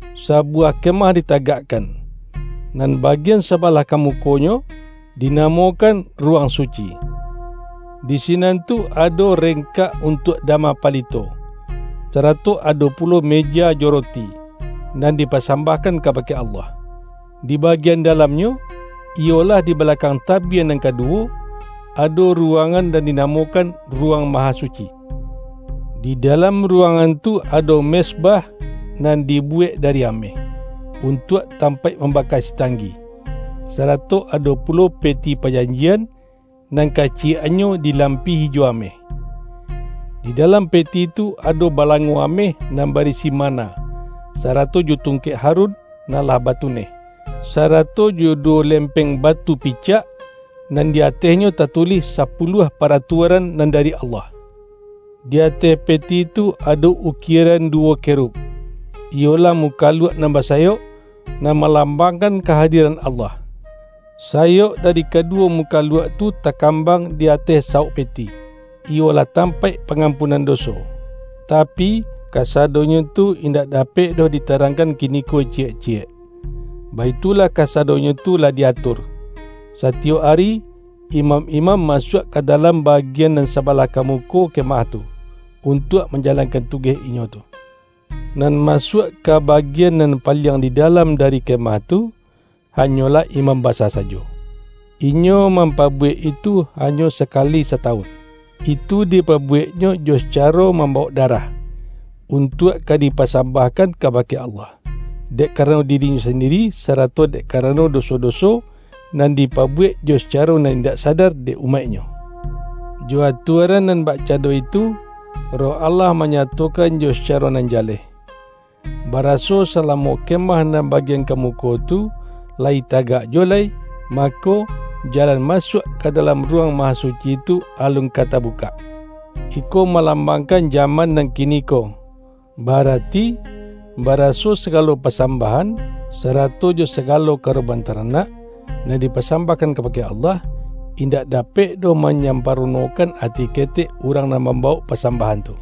Sabuwah ke-mah ditagakkan, nan bagian sabalah ka mukonyo dinamokan Ruwang Su-ci. Di sinan tu ado rengkak untuak da-ma palito, sarato ado pulo meja jo roti, nan dipasambahkan kabake Allah. Di bagian dalamnyo, iyolah di balakang tabie nan kaduwo, ado ruwangan nan dinamokan Ruwang Mahasuci. Di da-lam ruwangan tu ado mezbah nan di-buwek dari ameh, untuak tampaik mambaka sitanggi, sarato ado pulo Pe-ti Pajanjian, nan kaciyek-annyo dilampihi jo ameh. Di dalam Peti tu ado ba-lango ameh nan barisi manna, sarato jo tungkek Harun nan lah batuneh, sa-rato jo duwo lempeng batu picak, nan di atehnyo tatulih sapuluah paratua-ran nan dari Allah. Di ateh Peti tu ado ukieran duwo Kerub, iyolah mukaluak nan basayok, nan malambangkan ka-hadiran Allah. Sayok dari kaduwo mu-kaluak tu takambang di ateh sawok Pe-ti, iyolah tampaik pangampunan doso. Tapi, kasadonyo tu indak dapek doh ditarangkan kiniko ciyek-ciyek. Baitulah kasadonyo tu lah di-atur. Satiyok ari, imam-imam masuak ka dalam bagian nan sabalah ka muko kemah tu, untuak manjalankan tugeh inyo tu. Nan masuak ka bagian nan paliang di dalam dari kemah tu, ha-nyolah imam basa sajo. Inyo mampa-buwek itu hanyo sakali satawun. Itu dipabuweknyo jo sacaro mambawok darah, untuak ka dipasambahkan ka-bake Allah, dek karano dirinyo sandi-ri, sarato dek karano doso-doso, nan dipabuwek jo sacaro nan indak sadar dek umaiknyo. Jo atuaran nan bak-cando itu, Roh Allah manyatokan jo saearo nan jaleh, baraso salamo ke-mah nan bagian ka muko tu, layi ta-tagak juwo lai, mako, jalan masuak ka dalam Ruwang Mahasuci tu alun ka tabukak. Iko malambangkan jaman nan kiniko; ba-arati, baraso sagalo pa-sambahan, sarato jo sagalo karoban taranak, nan dipasambahkan kabake Allah, indak dapek doh manyamparo-nokan ati ketek urang nan mambawok pasambahan tu.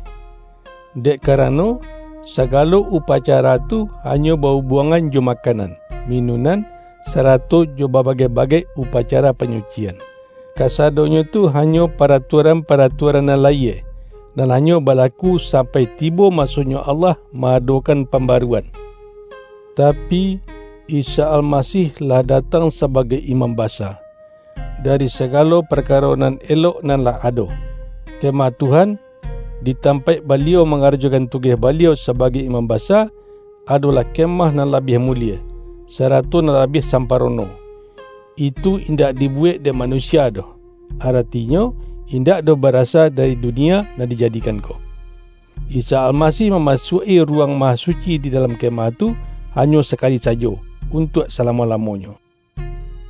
Dek karano, sagalo upacara tu hanyo ba-ubuangan jo ma-kanan, minunan, sarato jo babagai-ba-gai upacara panyucian. Kasadonyo tu hanyo paratuaran-paratuaran nan la-yie, nan hanyo balaku sampai tibo ma-sonyo Allah ma-adokan pambaruan. Tapi, Isa Almasih lah datang sa-bagai Imam Basa, dari sagalo parkaro nan elok nan lah ado. Kemah Tuhan, di tampaik Baliau mangarajokan tu-geh Baliau sabagai Imam Basa, ado-lah kemah nan labiah mulie, sarato nan labiah samparono. Itu indak di-buwek dek manusia doh; aratinyo, in-dak doh barasa dari dunia nan dija-dikan ko. Isa Almasih mamasuak-i Ruwang Mahasuci di dalam kemah tu, hanyo sakali sajo, untuak salamo-lamonyo.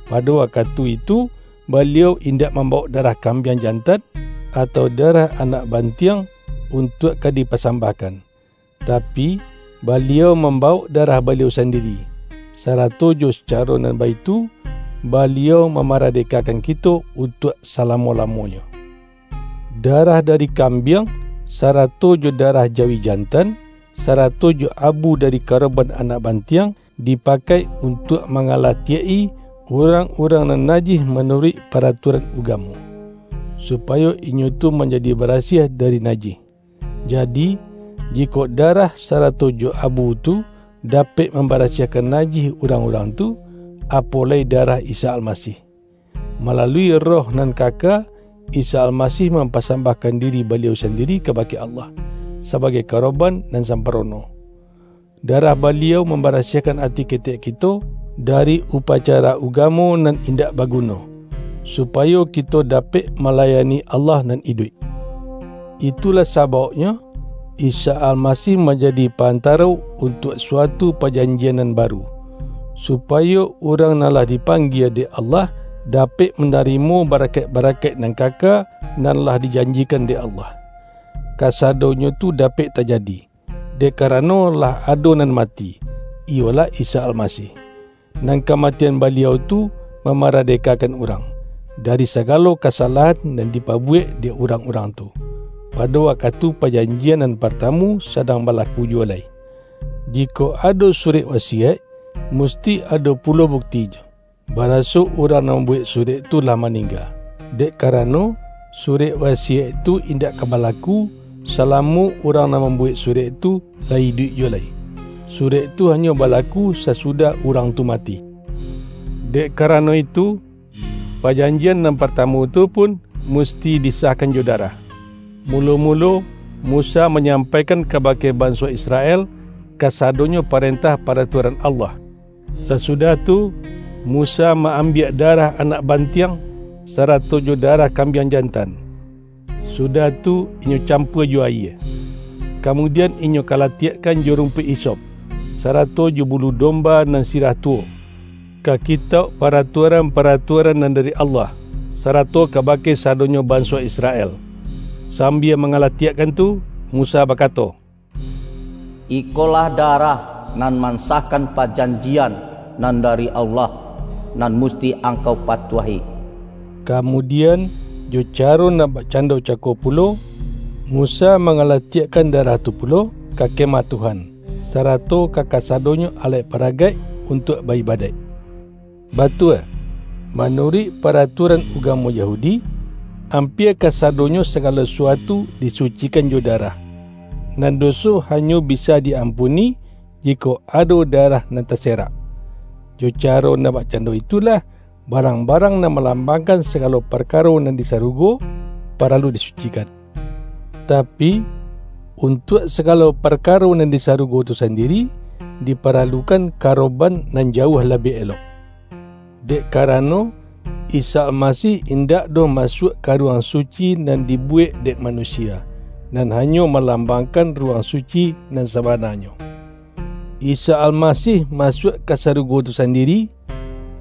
Pado wakatu itu, Baliau in-dak mambawok darah kambiang jan-tan, atau darah anak bantiang, untuak ka dipasambahkan; tapi, Baliau mam-bawok darah Baliau sandiri, sarato jo sacaro nan baitu, Baliau mamarade-kakan kito untuak salamo-lamonyo. Darah dari kambiang, sarato jo da-rah jawi jantan, sarato jo abu dari ka-roban anak bantiang, dipakai untuak mangalatiak-i, urang-urang nan najih manuruik paratuaran ugamo, supayo inyo tu manjadi barasiah dari najih. Jadi, jikok darah sarato jo abu tu, dapek mambarasiahkan najih urang-urang tu, apo lai darah Isa Almasih! Malalui Roh nan kaka, Isa Almasih mampasambahkan diri Baliau sandi-ri kabake Allah, sabagai karoban nan samparono. Darah Baliau mambara-siahkan ati ketek kito, dari upacara ugamo nan indak baguno, supayo kito dapek malayani Allah nan iduik. Itulah sabauknyo, Isa Almasih manjadi Pa-antaro untuak suatu pa-janjian nan baru, supayo urang nan lah dipanggie dek Allah, dapek mana-rimo barakaik-barakaik nan kaka, nan lah dijanjikan dek Allah. Kasadonyo tu dapek tajadi, dek karano lah ado nan mati, iyolah Isa Almasih; nan kamatian Baliau tu mamaradekakan urang, dari sagalo kasalahan nan dipabuwek dek urang-urang tu, pado wakatu pajanjian nan partamu sadang balaku juwo lai. Jikok ado surek wasiyaik, mus-ti ado pulo buktinyo, baraso urang nan mambuwek surek tu lah maning-ga. Dek karano, surek wasiyaik tu indak ka balaku, salamo urang nan mambuwek surek tu, layi iduik ju-wo lai. Surek tu hanyo balaku sasu-dah urang tu mati. Dek karano itu, pajanjian nan partamu tu pun, mus-ti disahkan jo darah. Mulo-mulo, Musa manyampaikan kabake ban-so Israel, kasadonyo parentah para-tuaran Allah. Sasudah tu, Musa ma-ambiak darah anak bantiang, sarato jo darah kambiang jantan, sudah tu, inyo campua jo ayie, kamudian, inyo kalatiakkan jo rumpuik hisop, sarato jo bulu domba nan sirah tuwo, ka Ki-tauk Paratuaran-paratuaran nan dari Allah, sarato kabake sadonyo banso Israel. Sambia mangalatiakkan tu, Musa bakato,”Ikolah darah nan man-sahkan pajanjian nan dari Allah, nan musti angkau patuahi.” Kamudian, jo caro nan bakcando cako pulo, Mu-sa mangalatiakkan darah tu pulo, ka Kemah Tuhan, sarato ka kasadonyo alaik-paragaik untuak ba-ibadaik. Batua, manuruik paratuaran uga-mo Yahudi, ampia kasadonyo sagalo sasuatu disucikan jo darah; nan doso hanyo bisa di-ampuni, jikok ado da-rah nan taserak. Jo caro nan bakcando itulah, ba-rang-barang nan malambangkan sa-galo parkaro nan di sarugo, paralu disucikan. Tapi, untuak sagalo par-karo nan di sarugo tu sandiri, dipara-lukan karoban nan jauah labiah elok. Dek karano, Isa Almasih indak doh masuak ka Ruwang Suci nan dibuwek dek manusia, nan hanyo malambang-kan Ruwang Suci nan sabananyo. Isa Almasih masuak ka sarugo tu sandi-ri;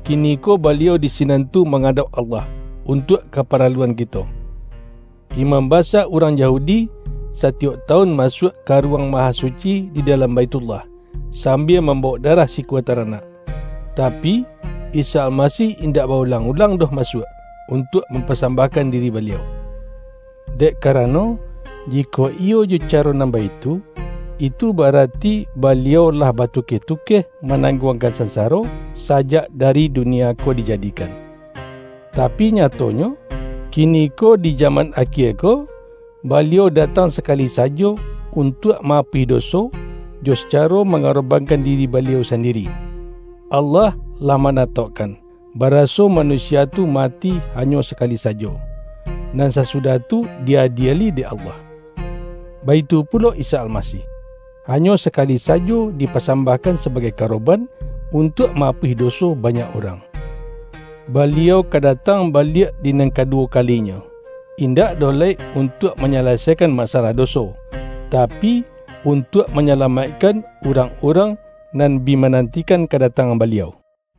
kiniko Baliau di sinan tu manga-dauk Allah untuak kaparaluan kito. Imam basa urang Yahudi, satiyok tawun masuak ka Ruwang Mahasu-ci di dalam Baithullah, sambia mam-bawok darah sikua taranak. Tapi, Isa Almasih indak ba-ulang-ulang doh masuak, untuak mampasambahkan diri Baliau. Dek karano, jikok iyo jo caro nan baitu, itu ba-arati Baliau lah batukeh-tukeh manangguangkan sansaro, sajak dari dunia ko dijadi-kan. Tapi nyatonyo, kiniko di jaman akie ko, Baliau datang sakali sajo un-tuak ma-apuih doso, jo sacaro manga-robankan diri Baliau sandiri. Allah lah manataukkan, baraso manusia tu mati hanyo sakali sajo, nan sasudah tu di-adieli dek Allah. Baitu pulo Isa Almasih, hanyo sakali sajo dipa-sambahkan sabagai karoban, untuak ma-apuih doso banyak urang. Baliau ka datang baliak di nan kaduwo ka-linyo, indak doh lai untuak manya-lasaikan masalah doso, tapi, untuak manyalamaikkan urang-urang nan bi manantikan kadatangan Baliau.